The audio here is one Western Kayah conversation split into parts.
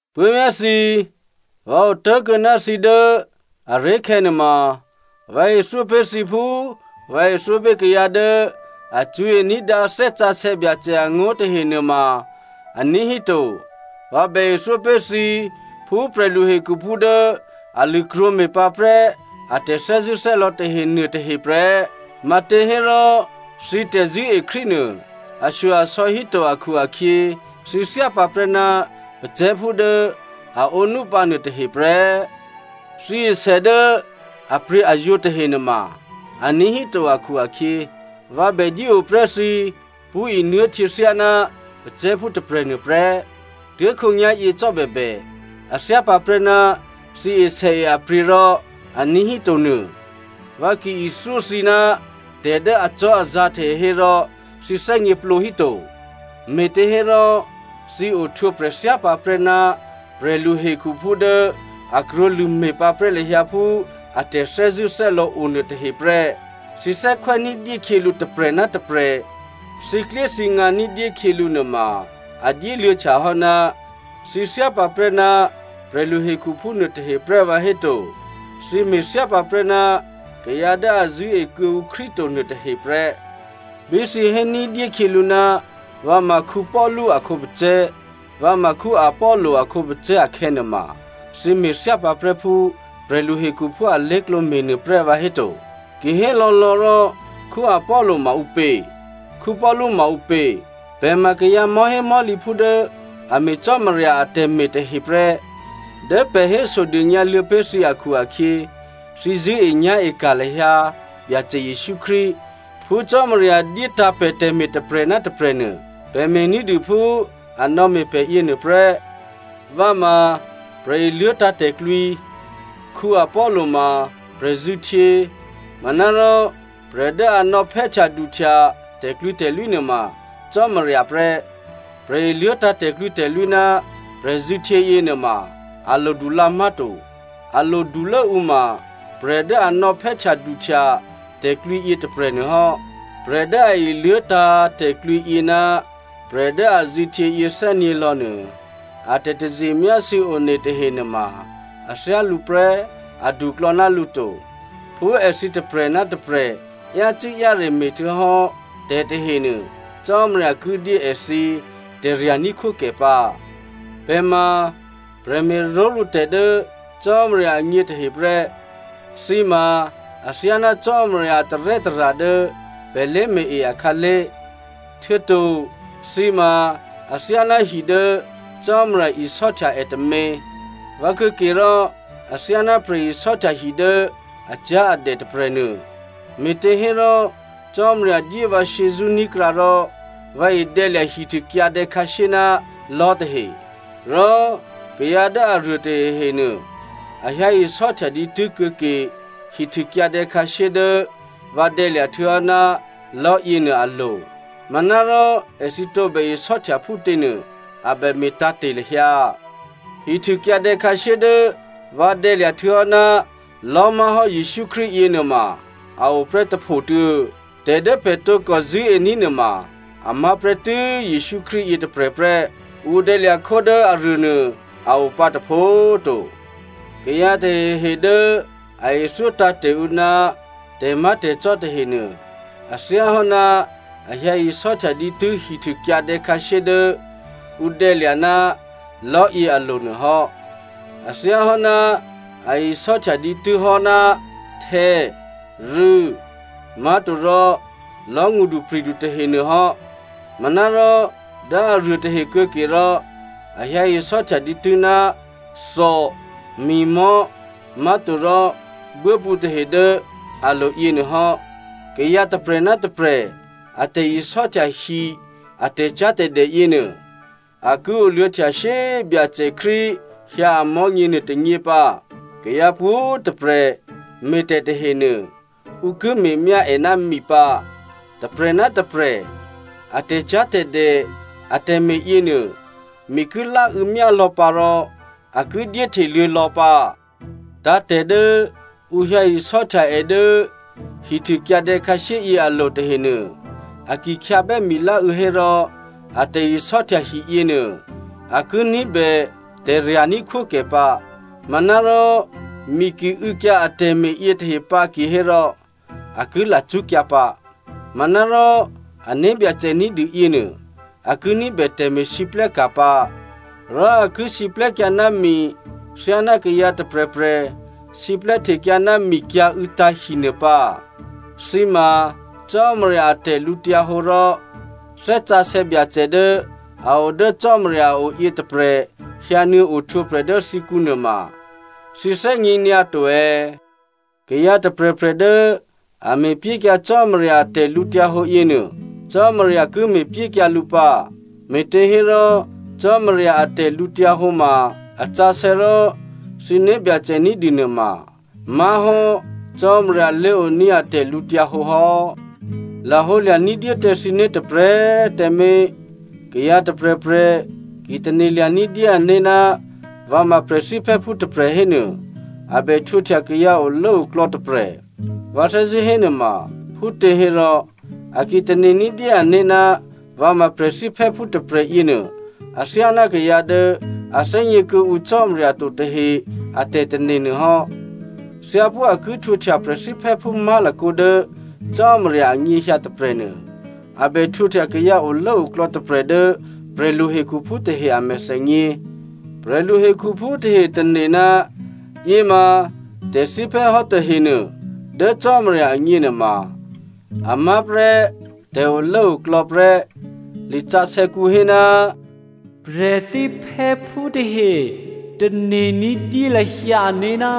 Puố̤vyá̤ thǐ꤮, vǎ otố̤kuô̌ ná thǐ dố aré̤khè̌ nuôma, vǎ ithyó pé̤ thǐ phú vǎ ithyó pé̤ kayǎ dố a cṳ̌e ní̤dǎ Thè́ Sǎsè̌ Byacè angó̤ tahe nuôma aní̤ hí to. Vǎ bè ithyó pé̤ thǐ phú prè̤luhekhu phú dố a lṳ̂krwǒ me̤ pǎprè́ a tè̤thè́zṳ̂́thè́lò̌ tahe nuôtahe prè́. Matěhérò thǐ tè̤zṳ̂́e Krístu nuô ashyo-asò̌ híto akhu-akhyě thǐ thyápǎprè́ ná pacè̤̌phú dố a ǒnúpǎ nuôtahe prè́. Thǐ esè dố apryě̤azwǒ tahe nuôma aní̤ híto akhu-akhyě, vǎ bè dyé ǒ prè́ thǐ pṳ́ nuô̤htyě thyáná pacè̤̌phú tôprè̤nuô prè́. Tuố̤khǒnyá̤yě cò́ bèbè a thyá pǎprè́ ná thǐ e sèe a pryě̤ rò a ní̤híto nuô. Vǎ ki ithyó thǐ ná tè̤ dố acò́azǎ̤ tahe hérò thǐ thè́gněplǒ hí to. Me̤těhérò thǐ ohtwǒprè̤ thyá pǎprè́ ná prè̤lu hekhuphú dố a krwǒlṳ̂ me̤ pǎprè́ lahyǎ phú a tè̤thè́zṳ̂́thè́lò̌ o nuôtahe prè́. Thǐ thè́khwè́ ní̤dyé khyělǔ tôprè̤ ná tôprè̤, thǐklyéthǐngǎ ní̤dyé khyělǔ nuôma a dyéluô̌htyahò́ ná thǐ thyá pǎprè́ ná prè̤lu hekhuphú nuôtahe prè́ vǎhéto? Thǐ me̤thyá pǎprè́ ná kayǎ dố a zṳ̂́e kuô̌ǔ Krístu to nuôtahe prè́. Bí thǐ hé ní̤dyé khyělǔ, vǎ ma Paulu a khǒpacè̤̌, vǎ ma Apollo a khǒpacè̤̌ akhè̌ nuôma, thǐ me̤ thyá pǎprè́ phú prè̤lu hekhuphú alé̤klǒ me̤nuô prè́ vǎhéto? Kihélò̌lò̌ rò, Apollo ma ǔpě? Paulu ma ǔpě? Pè̤ ma kayǎ mò̤́hémò̤́lǐphú dố a me̤ Cò́marya atè̤me̤ tahe prè́. Dố pè̤ hésodônyǎluô̌ pé̤ thǐ akhu-akhyě thǐ zṳ̂́enyá̤e ka̤ lahyǎ Byacè Jesǔ Krístu. Phú Cò́marya dyétǎ̤ pè̤ tè̤me̤ tôprè̤ ná tôprè̤ nuô, pè̤ me̤ ní̤dû phú a nò̌me̤ pè̤ yěnuô prè́. Vǎ ma prè̤iluố̤tǎ̤ tè̤klwǐ. Apollo ma prè̤zṳ̂htyě. Manárò prè̤ dố a nò̌phè́htyaduhtya tè̤klwǐtè̤lwí nuôma Cò́marya prè́. Prè̤iluố̤tǎ̤ tè̤klwǐtè̤lwí ná prè̤zṳ̂htyě yěnuôma a lodu lǎ má̤to. A lodulố ǔ ma prè̤ dố a nò̌phè́htyaduhtya tè̤klwǐ yětôprè̤nuô hò́. Prè̤ dố a iluố̤tǎ̤ tè̤klwǐ yě ná prè̤ dố a zṳ̂htyě yě thè́nyě̤ lò̌ nuô, a tè̤taze myásû̌ one tahe nuôma a thyálǔ prè́, aduklò̌ ná lǔ to. Phú èthǐ tôprè̤ ná tôprè̤ yácû́-yáre me̤htuô̌hò́ tè̤tahenuô Cò́marya ki dyé èthǐ tè̤rya̤ ní̤khwókè pǎ. Pè̤ ma prè̤me̤ró̤lǔtè̤ dố Cò́marya agně tahe prè́. Thǐ ma athyáná Cò́marya a tarè́tara̤ dố pè̤ lé̤me̤-e akhǎlé̤. Htuô̌to thǐ ma athyáná hi dố Cò́marya isò́htya è tômě. Vǎ kuô̌ke rò athyáná prè̤isò́htya hi dố acyá̤adè tôprè̤nuô. Me̤tehérò, Cò́marya dyé vǎ shyězṳ́ ní̤krǎ rò vǎ idè̌ lya̤ hihtû kyǎdè̌ khǎshyé ná lò̤́ tahe. Rò kayǎ dố aruô tahehenuô, a hyǎ isò́htya dǐtû́ kuô̌ke hihtûkyǎdè̌ khǎshyé dố vǎ dè̌lya̤ htuô̌hò́ ná lò̤́yě nuô alo̤. Manárò, èthǐ tǒbè isò́htya phútě nuô, a bè me̤ tǎ̤te̤ lahyǎ. Hihtûkyǎdè̌ khǎshyé dố vǎ dè̌lya̤ htuô̌hò́ ná lò̤́ má̤hò́ Jesǔ Krístu yěnuô ma a o prè́ tôphotuô̌. Tè̤ dố pè̤ tǒkò zṳ̂́ení̤ nuôma a má̤ prè́tû́ Jesǔ Krístu yětôprè̤ prè́. Ǔ dè̌lya̤ khó dố aruô nuô a o pǎ tôpho꤮ to. Kayǎ tahehe dố a ithyó tǎ̤te̤ ǔ ná tè̤má̤tè̤cò́ tahenuô, a thyáhò́ ná a hyǎ isò́htya dǐtû́ hihtû kyǎdè̌ khǎshyé dố ǔ dè̌lya̤ ná lò̤́ yě alo̤ nuô hò́. A thyáhò́ ná a isò́htya dǐtû́ hò́ ná htè̌, rû̌, má̤torò lò̤́ngṳdupri̤du tahenuô hò́. Manárò dố aruô tahe kuô̌ke rò, a hyǎ isò́htya dǐtû́ ná thò, mi̤mò̤́ má̤torò buốpǔ tahe dố alo̤ yěnuô hò́. Kayǎ tôprè̤ ná tôprè̤ a tè̤isò́htya hi a tè̤cyá̤tè̤dè yěnuô, a ki oluô̌htya shyé꤮ Byacè Krístu hyǎ amò̤́nyě nuôtônyě pǎ. Kayǎ pwǒ̤꤮ tôprè̤ me̤ tè̤ tahenuô, ǔ ki me̤myá è ná mi pǎ. Tôprè̤ ná tôprè̤ a tè̤cyá̤tè̤dè atè̤me̤ yěnuô, mi ki láû̌ myá lò̌ pǎ rò a ki dyé hteluô̌ lò̌ pǎ. Tǎ̤tè̤ dố ǔ hyǎ isò́htya è dố hihtû kyǎdè̌ khǎshyé yě alo̤ tahenuô, a ki khyǎbè́ miláû̌ hérò a tè̤isò́htya hi yěnuô a ki ní̤bè tè̤rya̤ ní̤khwókè pǎ. Manárò, mi ki û̌kyǎ atè̤me̤ yětahe pǎ kihérò, a ki lacṳ́kyǎ pǎ. Manárò, ané̤byacè ní̤dû yěnuô a ki ní̤bè tè̤me̤lwóhteka̤ pǎ. Rò a ki siplè́kyǎ ná mi thyáná kayǎ tôprè̤prè̤ siplè́htekyǎ ná mikyǎ̤û̌tǎ̤ hi nuô pǎ. Thǐ ma Cò́marya a tè̤lǔhǒdu rò Thè́ Sǎsè̌ Byacè dố a o dố Cò́marya a o yětôprè̤ hyǎ nuô̌ ohtwǒprè̤ dố thǐkǔ nuôma thǐ thè́gně nyǎ to è̌? Kayǎ tôprè̤prè̤ dố a me̤pyékyǎ Cò́marya a tè̤lǔhǒdu yěnuô, Cò́marya ki me̤pyékyǎ lǔ pǎ. Me̤těhérò Cò́marya a tè̤lǔhǒdu ma a sǎsè̌ rò thǐ né̤byacè ní̤dû nuôma má̤hò́ Cò́marya lé̤oní̤ a tè̤lǔhǒdu hò́. Lahǒlya̤ ní̤dyé tǎ thǐné̤ tôprè̤꤮ tǎmé̤. Kayǎ tôprè̤prè̤ ki tane̤lya̤ ní̤dyé ané̤ ná vǎ ma prè̤thíphè́phú tôprè̤ hénuô, a bè htwǒhtya kayǎ olốoklò̌ tôprè̤. Vǎ thè́zṳ̂́ hénuôma phútěhérò, è ki tane̤ ní̤dyé ané̤ ná vǎ ma prè̤thíphè́phú tôprè̤ yěnuô athyáná kayǎ dố a thè́gně kuô̌ǔ Cò́marya to tahe a tè̤tane̤ nuô hò́. Thyáphú a ki htwǒhtya prè̤thíphè́phú má̤lakǒ dố Cò́marya anyěhyǎ tôprè̤nuô, a bè htwǒhtya kayǎ olốoklò̌ tôprè̤ dố prè̤lu hekhuphú tahe a mèthènyě. Prè̤lu hekhuphú tahe tane̤ ná yěma tè̤thíphè́ hò́ tahenuô, dố Cò́marya agně nuôma a má̤ prè́ tè̤olốoklò̌ prè́. Lisǎsè̌kǔ hé, “Prè̤thíphè́phú tahe tane̤ ní̤dyé lahyǎ ané̤ ná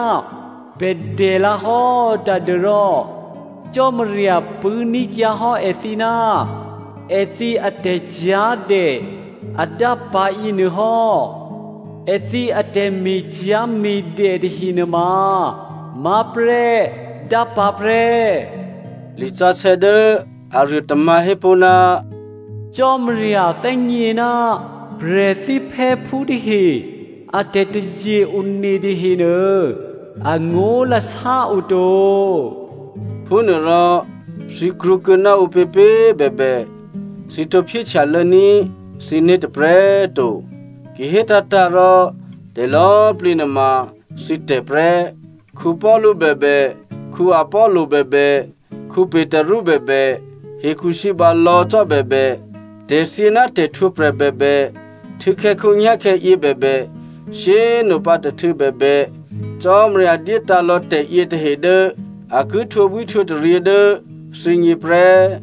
pè̤ dè lǎ hò́ tadû́rò Cò́marya pṳ̂́ní̤kyǎ hò́ èthǐ ná èthǐ atè̤cyá̤dè adápǎ̤ yěnuôhò́. Èthǐ atè̤me̤cyá̤me̤dè tahe nuôma má̤prè́ dápǎ̤ prè́.” Lisǎsè̌ dố aruô tômǎ̤ hé pó̤, “Cò́marya thè́gně ná prè̤thíphè́phú tahe a tè̤taze-one tahenuô, angó̤lasá o to.” Phúnuôrò, thǐ krwǒkuô̌ ná ǔpěpě꤮ bèbè, thǐ tǒ phyéhtyalô̌ ní̤ thǐné̤ tôprè̤꤮ to. Ki hé tǎ̤tǎ̤ rò, tè̤lò̌꤮ plǐ nuôma thǐ tè̤ prè́. Paulu bèbè, Apollo bèbè, Petru bèbè, hekhusǐba lò̌ cò́ bèbè, tè̤thyě ná tè̤htwǒprè̤ bèbè, htû̌khè̌ khǒnyá̤khè̌ yěbèbè, shyé꤮ nopǎ tôhtû̌ bèbè, Cò́marya dyétǎ̤ lò̌ tè̤yětahe dố a ki htwǒbwíhtwǒtaryě dố thǐgně prè́.